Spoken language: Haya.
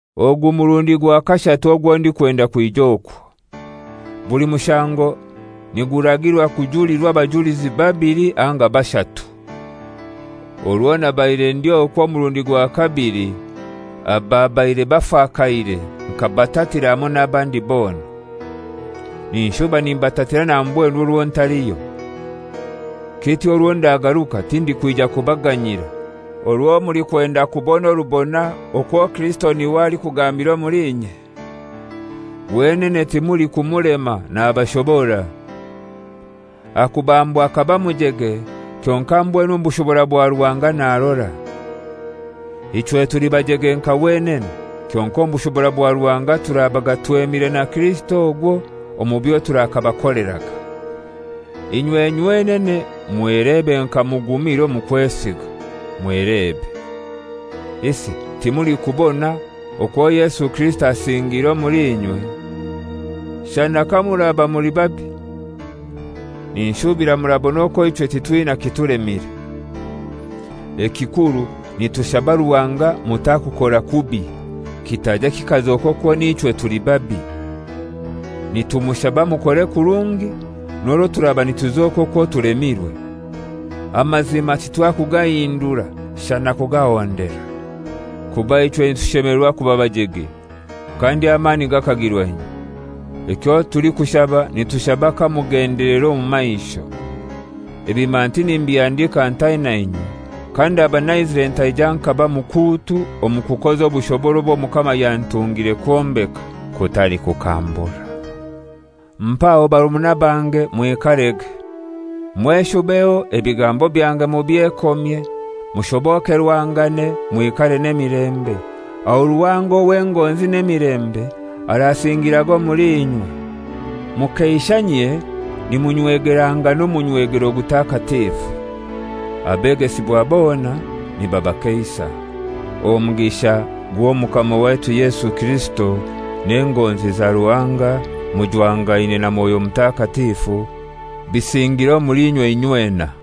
Ogu murundi gwa kashatu ogwo ndikwenda kwija okwo. Buli mushango niguragirwa kujulirwa abajulizi babili anga bashatu. Orwo nabaire ndi okwo omurundi gwa kabili, ababaire bafakaire nkabatatira hamoi n'abandi bona. Ninshuba nimbatatira na mbwenu orwo ntaliyo. Kityo orwo ndagaruka tindikwija kubaganyira, orwo mulikwenda kubona orubona okwo Kirisito n'iwe alikugambira omuli inye. Wenene timulikumulema, nabashobora. Aha kubambwa akaba mujege, kyonkai mbwenu omu bushobora bwa Ruhanga narora. Ichwe tuli bajege nka wenene, kyonkai omu bushobora bwa Ruhanga turabaga twemire na Kirisito ogwo omu byo turakabakoleraga. Inywe nywenene mwelebe nka mugumire omu kwesiga. Mwelebe. Isi timulikubona okwo Yesu Kirisito asingiire omuli inywe? Shana kamuraba muli babi! Ninshubira murabona okwo ichwe titwina kitulemire. Ekikuru nitushaba Ruhanga mutakukora kubi, kitaija kikazoka okwo nichwe tuli babi. Nitumushaba mukore kurungi, n'orwo turaba nituzoka okwo tulemirwe. Amazima titwakugahindura, shana kugahondera. Kuba ichwe nitushemelerwa kuba bajege, kandi amani gakagirwa inywe. Ekyo tulikushaba nitushaba kamugendelera omu maisho. Ebi manti nimbihandika ntaina inywe, kandaba naizire ntaija nkaba mukuutu omu kukoza obushobora obwo Omukama yantungire kwombeka, kutali kukambura. Mpaho barumuna bange, mwikarege. Mweshubeho, ebigambo byange mubyekomye, mushobokerwangane, mwikare n'emilembe, aho Ruhanga ow'engonzi n'emilembe arasingiraga omuli inywe. Mukeishanyie nimunywegerangana omunywegero gutakatifu. Abegesibwa bona nibabakeisa. omugisha gw'Omukama waitu Yesu Kirisito, n'engonzi za Ruhanga, mujwangaine na Mwoyo Mutakatifu, bisingire omuli inywe inywena.